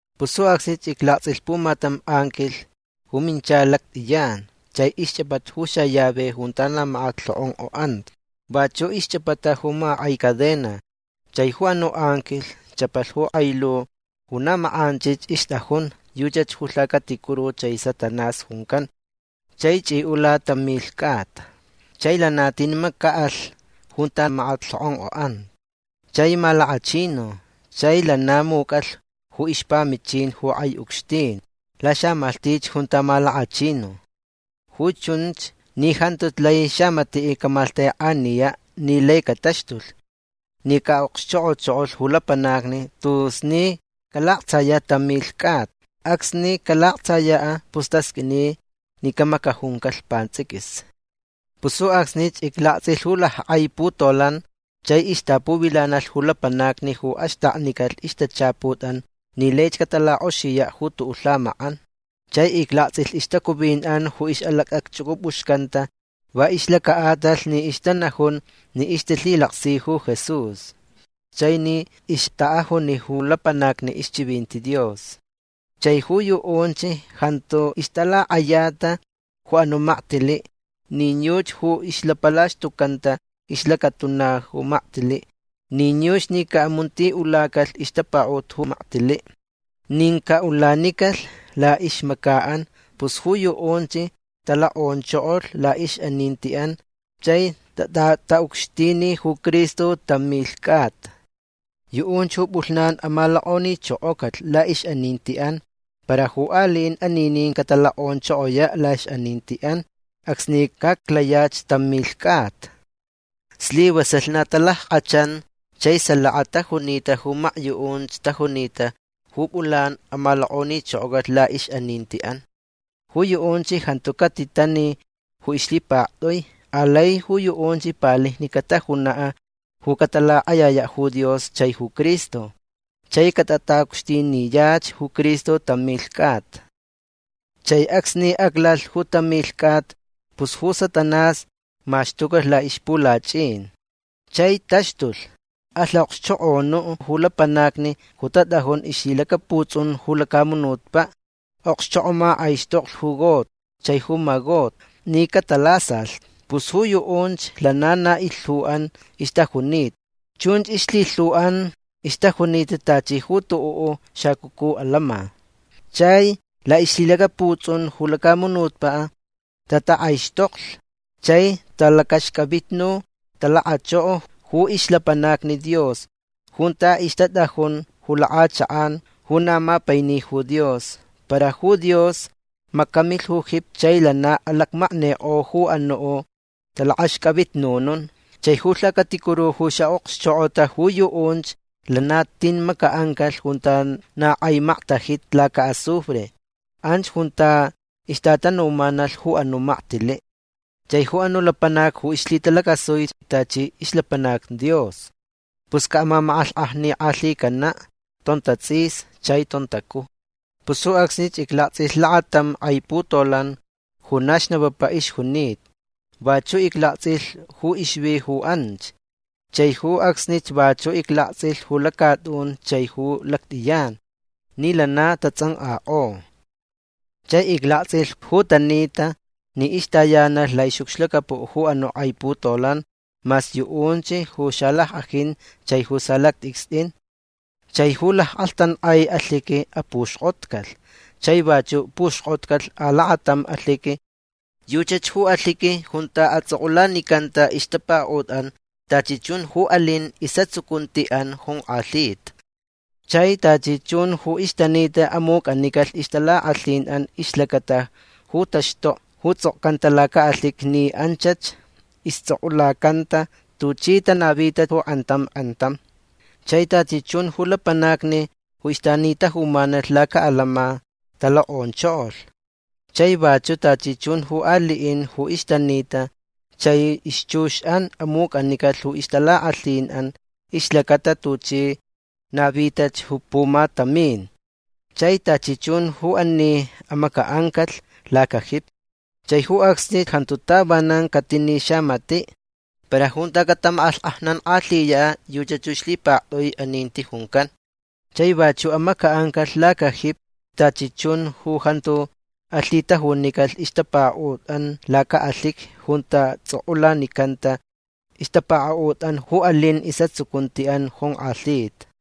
Pus ju acsnich iclaktsʼilh pumatam anquilh ju minchalh lactʼiyan. Chai ixchʼapata ju xallave junta na makat lhokʼonkʼoʼanta. Vachuʼ ixchʼapata ju makakʼai cadena. Chai ju anuʼ anquilh chʼapalh ju kʼai lu ju na makʼanchich ixtʼajun. Yuchach ju lhacaticuru chai Satanás juncan. Chai chʼiʼula tam milh cʼata. Chai lana tin macaʼalh junta makat lhokʼonkʼoʼanta. Chai malakachinu. Chai lana mucʼalh ju ixpamichin ju kʼai ucxtin laxamalhtich junta malakachinu. Ju chunch ni jantuch lai xamatiʼ camaklhtekʼaniyaʼ ni lai cataxtulh ni caʼaʼokxchokʼochokolh ju lapanacni tus ni calaktsayanta tam milh cʼata. Acsni calaktsayach pus tasqʼuini ni camacajuncalh pantsʼiquis. Pus ju acsnich iclaktsʼilh ju lackʼai putolan chai ixtapuvilanalh ju lapanacni ju axtaknicalh ixtachaputʼan ni laich catalakʼoxiyaʼ ju tuʼuʼ lhamakʼan. Chai iclaktsʼilh ixtacuvinʼan ju ixʼalacʼacchʼucʼupʼuxcanta va ixlacaʼatalh ni ixtanajun ni ixtalhilaksi ju Jesús chai ni ixtaʼajuni ju lapanacni ixchivinti Dios. Chai ju yuʼunch jantu ixtalakʼayata ju anuʼ maktiliʼ nin yuchi ju ixlapalaxtucanta ixlacatuna ju maktiliʼ nin yuchi ni caʼamuntiʼulacalh ixtapakaʼut ju maktiliʼ nin caʼulanicalh laʼixmacaʼan. Pus ju yuʼunch talokʼonchokolh laʼixʼanintiʼan chai tatʼataʼucxtini ju Cristo tam milh cʼata. Yuʼunch ju pʼulhnan amalokʼonichokocalh laʼixʼanintiʼan. Para ju aliʼin aninin catalokʼonchokoyaʼ laʼixʼanintiʼan acsni caʼaclayaʼ tam milh cʼata. Slivasalh na talackʼachan chai salaka tajunita ju makyuʼunch tajunita ju pʼulan amalokʼonichokocalh laʼixʼanintiʼan. Ju yuʼunch jantu catitani ju ixlhipaktʼui. Alai yuʼunch palijni catajunaʼ ju catalakʼayayaʼ ju Dios chai ju Cristo. Chai catatʼataʼucxtiniyach ju Cristo tam milh cʼata. Chai acsni aclalhch ju tam milh cʼata pus ju Satanás maxtucalh laʼixpulachʼin. Chai taxtulh. Alh aʼokxchokʼonuʼ ju lapanacni ju tatʼajun ixlhilacaputsʼun ju lacamunutpaʼ. Aʼokxchokʼomakʼaixtoklh ju Gog chai ju Magog ni catalasalh. Pus ju yuʼunch lana na ilhuʼan ixtajunita. Chunch ilhilhuʼan ixtajunita tachi ju tuʼuʼ xacucu alama. Chai laʼixlhilacaputsʼun ju lacamunutpaʼ tatakʼaixtoklh. Chai talakʼaxcʼavitnu talakachoko ju ixlapanacni Dios junta ixtatʼajun ju lakʼachakʼan ju na mapaini ju Dios. Para ju Dios macamilh ju jipi chai lana alacmaknikʼo ju anuʼ talakʼaxcʼavitnunun. Chai ju lhacaticuru ju ixʼaʼokxchokʼota ju yuʼunch lana tin macaʼancalh junta na kʼai maktajita lacaʼazufre. Anch junta ixtatanumanalh ju anuʼ maktiliʼ chai ju anuʼ lapanac ju ixlhitalacasuich tachi ixlapanac Dios. Pus caʼamamakʼalhkʼajnikʼalhicanaʼ tontatsʼis chai tontacuj. Pus ju acsnich iclaktsʼilh lakatam kʼai putolan ju na xnapapa ixjunita. Vachuʼ iclaktsʼilh ju ixvi ju anch. Chai ju acsnich vachuʼ iclaktsʼilh ju lacatʼun chai ju lactʼiyan ni lana tatsʼankʼakʼo. Chai iclaktsʼilh ju tanita ni ixtayanalh laʼixʼucxlacapuʼ ju anuʼ kʼai putolan mas yuʼunch ju xalackʼajin chai ju salactʼicstʼin. Chai ju lackʼalhtankʼai alhiqui apuxkʼotcalh. Chai vachuʼ puxkʼotcalh alakatam alhiqui. Yuchach ju alhiqui junta atsʼokʼulanicanta ixtapakaʼutʼan tachi chun ju alin isʼatsucuntiʼan jonkʼalhita. Chai tachi chun ju ixtanita amucʼanicalh ixtalakʼalhinʼan ixlacata ju taxtokni ju tsʼokcanta lacaʼalhiqui ni anchach istsʼokʼulakʼocanta tuchi tanavita ju kʼantam kʼantam. Chai tachi chun ju lapanacni ju ixtanitajumanalh lacaʼalama talokʼonchokolh. Chai vachuʼ tachi chun ju aliʼin ju ixtanita. Chai ixchuxʼan amucʼanicalh ju ixtalakʼalhinʼan ixlacata tuchi navitach ju pumatamin. Chai tachi chun ju ani amacaʼancalh ju lacajipi. Chai ju acsni jantu tavanan catini xamatiʼ. Para junta catamakʼalhkʼajnankʼalhiyaʼ yuchach ju ixlhipaktʼui aninti juncan. Chai vachuʼ amacaʼancalh lacajipi tachi chun ju jantu alhitajunicalh ixtapakaʼutʼan lacaʼalhiqui junta tsʼokʼulanicanta ixtapakaʼutʼan ju alin isʼatsucuntiʼan jonkʼalhita.